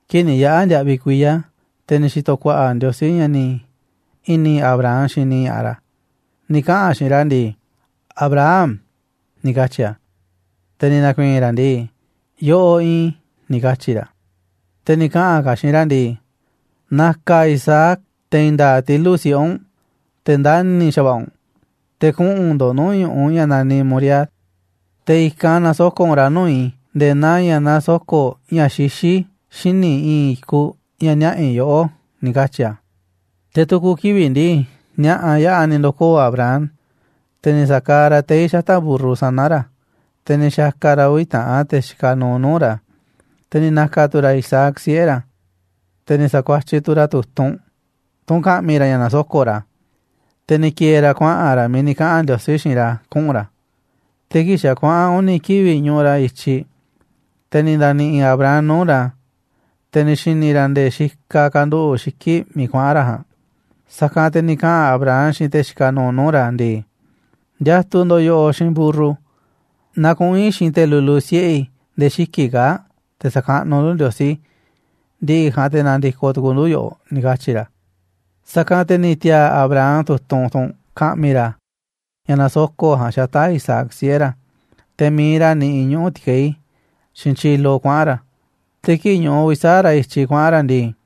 Kii̱ꞌ ni̱ yaꞌa̱ ndiaꞌviꞌ kuiya̱, te̱ ni̱ xi̱to̱ ku̱a̱ꞌa̱ Ndiosí ña̱ ni̱ i̱ni̱ Abraham xini ña̱ꞌaꞌ ra̱, ni̱ kaꞌa̱n a̱ xiinꞌ ra̱ ndii: ―¡Abraham! ―ni̱ katyi̱ a̱. Te̱ ni̱ na̱ku̱i̱i̱n ra̱ ndii: ―Yoꞌoꞌ iinꞌ i̱ ―ni̱ katyi̱ ra̱. Te̱ ni̱ kaꞌa̱n ka̱ a̱ xiinꞌ ra̱ ndii: ―Na̱ka̱ Isaac, te̱ i̱i̱n nda̱a̱ꞌ tilu̱ꞌ siꞌe̱ u̱nꞌ, te̱ ndani̱ xa̱va̱ꞌa̱ u̱nꞌ, te̱ kuꞌu̱n ndo̱ꞌ nuu̱ꞌ ñu̱ꞌuꞌ ña̱ naniꞌ Moriah, te̱ i̱kanꞌ na̱soko̱ꞌ u̱nꞌ ra̱ nuu̱ꞌ i̱ nde̱e̱ naa ña̱ nasoko̱ꞌ ña̱ xixí, xíniꞌ i̱i̱n i̱kuꞌ ña̱ niaꞌa̱ i̱ yoꞌó ―ni̱ katyi̱ a̱. Te̱ tu̱ku̱ kivi̱ꞌ ndii, ni̱a̱ꞌa̱ yaꞌa̱ ni̱ ndo̱koo̱ Abraham, te̱ ni̱ sa̱kaaꞌ ra̱ tei̱ xata̱ꞌ mburru sana̱ ra̱, te̱ ni̱ xa̱ka̱ ra̱ uvi̱ taꞌan te̱ xikaꞌ nuuꞌ nuu̱ꞌ ra̱, te̱ ni̱ na̱ka̱ tu̱ ra̱ Isaac, siꞌe̱ ra̱. Te̱ ni̱ sa̱kuatyiꞌ tu̱ ra̱ tu̱tunꞌ, tunꞌ ka̱ꞌmi̱ ra̱ ña̱ na̱soko̱ꞌ ra̱, te̱ ni̱ ki̱e̱e̱ ra̱ kuaꞌa̱n ra̱ miiꞌ ni̱ kaꞌa̱n Ndiosí xiinꞌ ra̱ kuꞌu̱n ra̱. Te̱ kii̱ꞌ xa̱ kuaꞌa̱n uni̱ kivi̱ꞌ ñuꞌuꞌ ra̱ i̱tyiꞌ, te̱ ni̱ nda̱ni̱ꞌi̱ Abraham nuu̱ꞌ ra̱, te̱ ni̱ xi̱ni̱ ra̱ nde̱e̱ xikaꞌ kanduꞌu̱ꞌ xiki̱ꞌ miiꞌ kuaꞌa̱n ra̱ ja̱a̱nꞌ. Sa̱kanꞌ te̱ ni̱ kaꞌa̱n Abraham xiinꞌ te̱ xikaꞌ nuuꞌ nuu̱ꞌ ra̱ ndii: ―Ndiatuꞌ ndo̱ꞌ yoꞌoꞌ xiinꞌ mburru, na kuꞌu̱n i̱ xiinꞌ te̱ lulu siꞌe̱ i̱ nde̱e̱ xiki̱ꞌ kaa̱ꞌ, te̱ sa̱kaꞌnuꞌ ndu̱ Ndiosí, ndi̱ꞌi̱ ja̱a̱nꞌ te̱ na̱ndi̱koꞌ tu̱ku̱u̱ ndu̱ yoꞌoꞌ ―ni̱ katyi̱ ra̱. Sa̱kanꞌ te̱ ni̱ ti̱a̱a̱ Abraham tu̱tunꞌ, tunꞌ ka̱ꞌmi̱ ra̱ ña̱ na̱soko̱ꞌ ja̱a̱nꞌ, xata̱ꞌ Isaac, siꞌe̱ ra̱, te̱ mi̱iꞌ ra̱ niꞌiꞌ ñuꞌu̱ ti̱kei̱, xiinꞌ tyilo kuaꞌa̱n ra̱. Te̱ kii̱ꞌ ñuꞌuꞌ uvi̱ sa̱aꞌ ra̱ i̱tyiꞌ kuaꞌa̱n ra̱ ndii,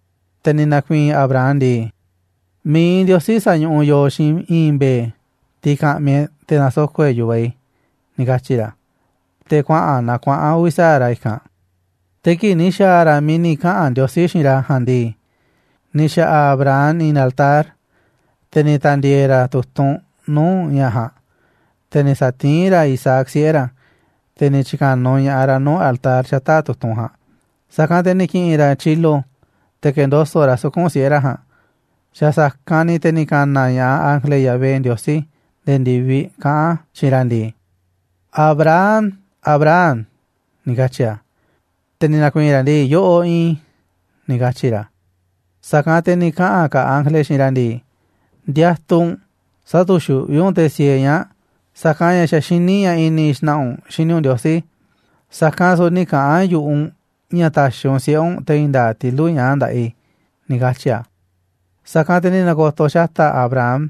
Te̱ ni̱ na̱ku̱i̱i̱n Abraham ndii: ―Mi̱iꞌ Ndiosí sa̱ñuꞌuꞌ yooꞌ xiinꞌ i̱i̱n mbe̱e̱, tiꞌ ka̱ꞌmi̱ e̱ꞌ te̱ na̱soko̱ꞌ e̱ꞌ, yu̱vaꞌ i̱ ―ni̱ katyi̱ ra̱. Te̱ kuaꞌa̱n na kuaꞌa̱n uvi̱ sa̱aꞌ ra̱ i̱kanꞌ. Te̱ kii̱ꞌ ni̱ xa̱a̱ ra̱ miiꞌ ni̱ kaꞌa̱n Ndiosí xiinꞌ ra̱ ja̱a̱nꞌ ndii, ni̱ xa̱ꞌa̱ Abraham i̱i̱n altar, te̱ ni̱ ta̱ndi̱e̱e̱ ra̱ tu̱tunꞌ nuu̱ꞌ ña̱ ja̱a̱nꞌ, te̱ ni̱ sa̱tiín ra̱ Isaac, siꞌe̱ ra̱, te̱ ni̱ tyi̱ka̱nuꞌ ña̱ꞌaꞌ ra̱ nuu̱ꞌ altar xata̱ꞌ tu̱tunꞌ ja̱a̱nꞌ. sa̱kanꞌ te̱ ni̱ ki̱ꞌi̱n ra̱ tyilo te̱ ke̱ndoso̱ꞌ ra̱ suku̱nꞌ siꞌe̱ ra̱ ja̱a̱nꞌ. Xa̱ sa̱kanꞌ ni̱ te̱ ni̱ ka̱na̱ ña̱ꞌaꞌ ángele Yahvé Ndiosí nde̱e̱ ndi̱viꞌ, kaꞌán a̱ xiinꞌ ra̱ ndii: ―¡Abraham! ¡Abraham! ―ni̱ katyi̱ a̱. Te̱ ni̱ na̱ku̱i̱i̱n ra̱ ndii: ―Yoꞌoꞌ iinꞌ i̱ ―ni̱ katyi̱ ra̱. Sa̱kanꞌ te̱ ni̱ kaꞌa̱n ka̱ ángele xiinꞌ ra̱ ndii: ―Ndiatuꞌ u̱nꞌ, sä̱tu̱xuꞌví u̱nꞌ te̱ siee ñaa̱ꞌ, sa̱kanꞌ ña̱ xa̱ xiní i̱ ña̱ i̱ni̱ xna̱ꞌa̱ u̱nꞌ xini u̱nꞌ Ndiosí. Sa̱kanꞌ su̱u̱ nï̱ kaꞌa̱n yu̱ꞌuꞌ u̱nꞌ ña̱ ta̱xi̱ u̱nꞌ siꞌe̱ u̱nꞌ, te̱ i̱i̱n nda̱a̱ꞌ tilu̱ꞌ ñaa̱ꞌ nda̱ꞌaꞌ i̱ ―ni̱ katyi̱ a̱. Sa̱kanꞌ te̱ ni̱ na̱ko̱to̱ xata̱ꞌ Abraham,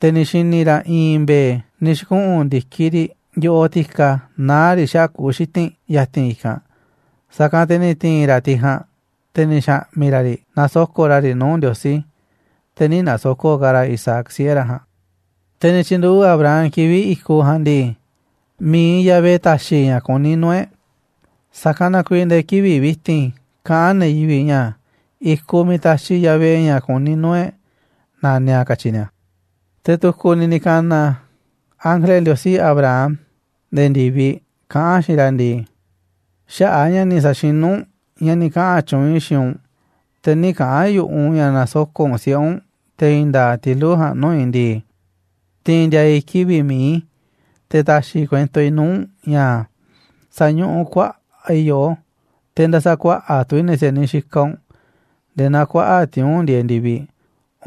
te̱ ni̱ xi̱ni̱ ra̱ i̱i̱n mbe̱e̱ ni̱ xi̱kuꞌu̱n ndi̱kiꞌ riꞌ yo̱ꞌoꞌ ti̱ka naá riꞌ xaꞌa̱ꞌ kuꞌu̱ xiti̱nꞌ ya̱ti̱n i̱kanꞌ. Sa̱kanꞌ te̱ ni̱ ti̱i̱n ra̱ tiꞌ ja̱a̱nꞌ, te̱ ni̱ xa̱ꞌmi̱ ra̱ riꞌ nasoko̱ꞌ ra̱ riꞌ nuu̱ꞌ Ndiosí, te̱ nï̱ na̱soko̱ꞌ ka̱ ra̱ Isaac siꞌe̱ ra̱ ja̱a̱nꞌ. Te̱ ni̱ tyi̱nduꞌu̱ꞌ Abraham kivi̱ꞌ i̱kuꞌ ja̱a̱nꞌ ndii: «Mi̱iꞌ Yahvé ta̱xi̱ ña̱ kuní nuu̱ꞌ e̱ꞌ». Sa̱kanꞌ na kuiiꞌ nde̱e̱ kivi̱ꞌ vi̱ti̱n kaꞌán ne̱ yivi̱ꞌ ña̱ i̱kuꞌ miiꞌ taxiꞌ Yahvé, ña̱ kuní nuu̱ꞌ e̱ꞌ naniꞌ a̱, katyi ni̱a̱. Te̱ tu̱ku̱ ni̱ ni̱ ka̱na̱ ángele Ndiosí Abraham nde̱e̱ ndi̱viꞌ, kaꞌán a̱ xiinꞌ ra̱ ndii: ―Xaꞌa̱ꞌ a̱ ña̱ ni̱ sa̱xinú u̱nꞌ ña̱ ni̱ kaꞌa̱n tyuunꞌ i̱ xiinꞌ u̱nꞌ, te̱ nï̱ kaꞌa̱n yu̱ꞌuꞌ u̱nꞌ ña̱ na̱soko̱ꞌ u̱nꞌ siꞌe̱ u̱nꞌ, te̱ i̱i̱n nda̱a̱ꞌ tilu̱ꞌ ja̱a̱nꞌ nuu̱ꞌ i̱ ndii, tiinꞌ ndiaa i̱ kivi̱ꞌ mi̱iꞌ i̱, te̱ taxiꞌ i̱ kuento i̱ nuu̱ꞌ u̱nꞌ ña̱, sa̱ñuꞌuꞌ kuaꞌa̱ꞌ i̱ yoꞌó, te̱ nda̱sa̱kuaꞌa̱ꞌ tu̱ i̱ ne̱ si̱a̱niꞌ xikaꞌ u̱nꞌ nde̱e̱ naa kuaꞌa̱ꞌ tiuu̱nꞌ ndieeꞌ ndi̱viꞌ,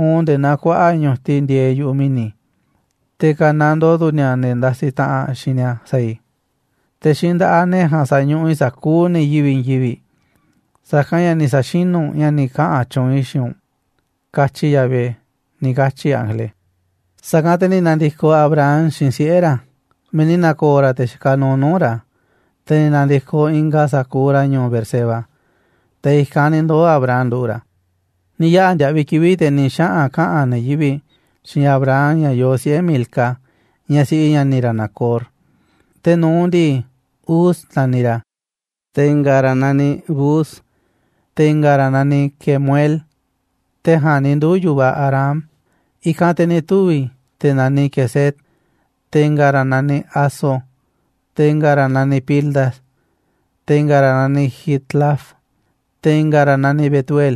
uun nde̱e̱ naa kuaꞌa̱ꞌ ñu̱tiꞌ ndieeꞌ yu̱ꞌuꞌ mi̱ni̱. Te̱ ka̱nandoo tu̱ ni̱a̱ ne̱ ndasiꞌ taꞌanꞌ xiinꞌ ni̱a̱ sa̱a̱ i̱. Te̱ xiinꞌ nda̱ꞌaꞌ ne̱ ja̱a̱nꞌ sa̱ñuꞌuꞌ i̱ sa̱kuuꞌ ne̱ yivi̱ꞌ i̱i̱n yivi̱ꞌ, sa̱kanꞌ ña̱ ni̱ sa̱xinu̱ u̱nꞌ ña̱ ni̱ kaꞌa̱n tyuunꞌ i̱ xiinꞌ u̱nꞌ, katyi Yahvé ―ni̱ katyi̱ ángele. Sa̱kanꞌ te̱ ni̱ na̱ndi̱koꞌ Abraham xiinꞌ siꞌe̱ ra̱ miiꞌ ni̱ na̱ko̱o̱ ra̱ te̱ xikaꞌ nuuꞌ nuu̱ꞌ ra̱, te̱ ni̱ na̱ndi̱koꞌ ingaꞌ sa̱kuuꞌ ra̱ ñu̱u̱ Beerseba, te̱ i̱kanꞌ ni̱ ndoo̱ Abraham nduꞌu̱ꞌ ra̱. Ni̱ yaꞌa̱ ndiaꞌviꞌ kivi̱ꞌ, te̱ ni̱ xaꞌa̱n kaꞌa̱n ne̱ yivi̱ꞌ xiinꞌ Abraham ña̱ yoo siꞌe̱ Milca, ñaꞌ siꞌi ña̱ni̱ ra̱ Nacor. Te̱ nu̱uꞌ ndii, Uz naniꞌ ra̱, te̱ i̱nga̱ ra̱ naniꞌ Buz, te̱ i̱nga̱ ra̱ naniꞌ Kemuel, te̱ ja̱a̱nꞌ ni̱ nduu̱ yu̱vaꞌ Aram. I̱kanꞌ te̱ ni̱ tuvi̱ te̱ naniꞌ Quesed, te̱ i̱nga̱ ra̱ naniꞌ Hazo, te̱ i̱nga̱ ra̱ naniꞌ Pildas, te̱ i̱nga̱ ra̱ naniꞌ Jidlaf, te̱ i̱nga̱ ra̱ naniꞌ Betuel.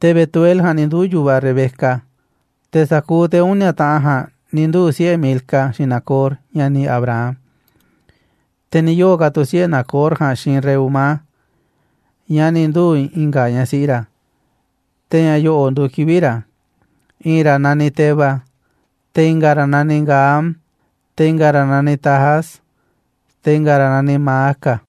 Te̱ Betuel ja̱a̱nꞌ ni̱ nduu̱ yu̱vaꞌ Rebeca. Te̱ sa̱kuuꞌ te̱ uni̱a̱ taꞌan ja̱a̱nꞌ ni̱ nduu̱ siꞌe̱ Milca xiinꞌ Nacor, ña̱ni̱ Abraham. Te̱ ni̱ yoo̱ ka̱ tu̱ siꞌe̱ Nacor ja̱a̱nꞌ xiinꞌ Reumá, ñaꞌ ni̱ nduu̱ i̱nga̱ ñaꞌ siꞌi ra̱, te̱ ña̱ yo̱ꞌo̱ nduuꞌ kivi̱ꞌ ra̱. I̱i̱n ra̱ naniꞌ Teba, te̱ i̱nga̱ ra̱ naniꞌ Gaham, te̱ i̱nga̱ ra̱ naniꞌ Tahas, te̱ i̱nga̱ ra̱ naniꞌ Maaca.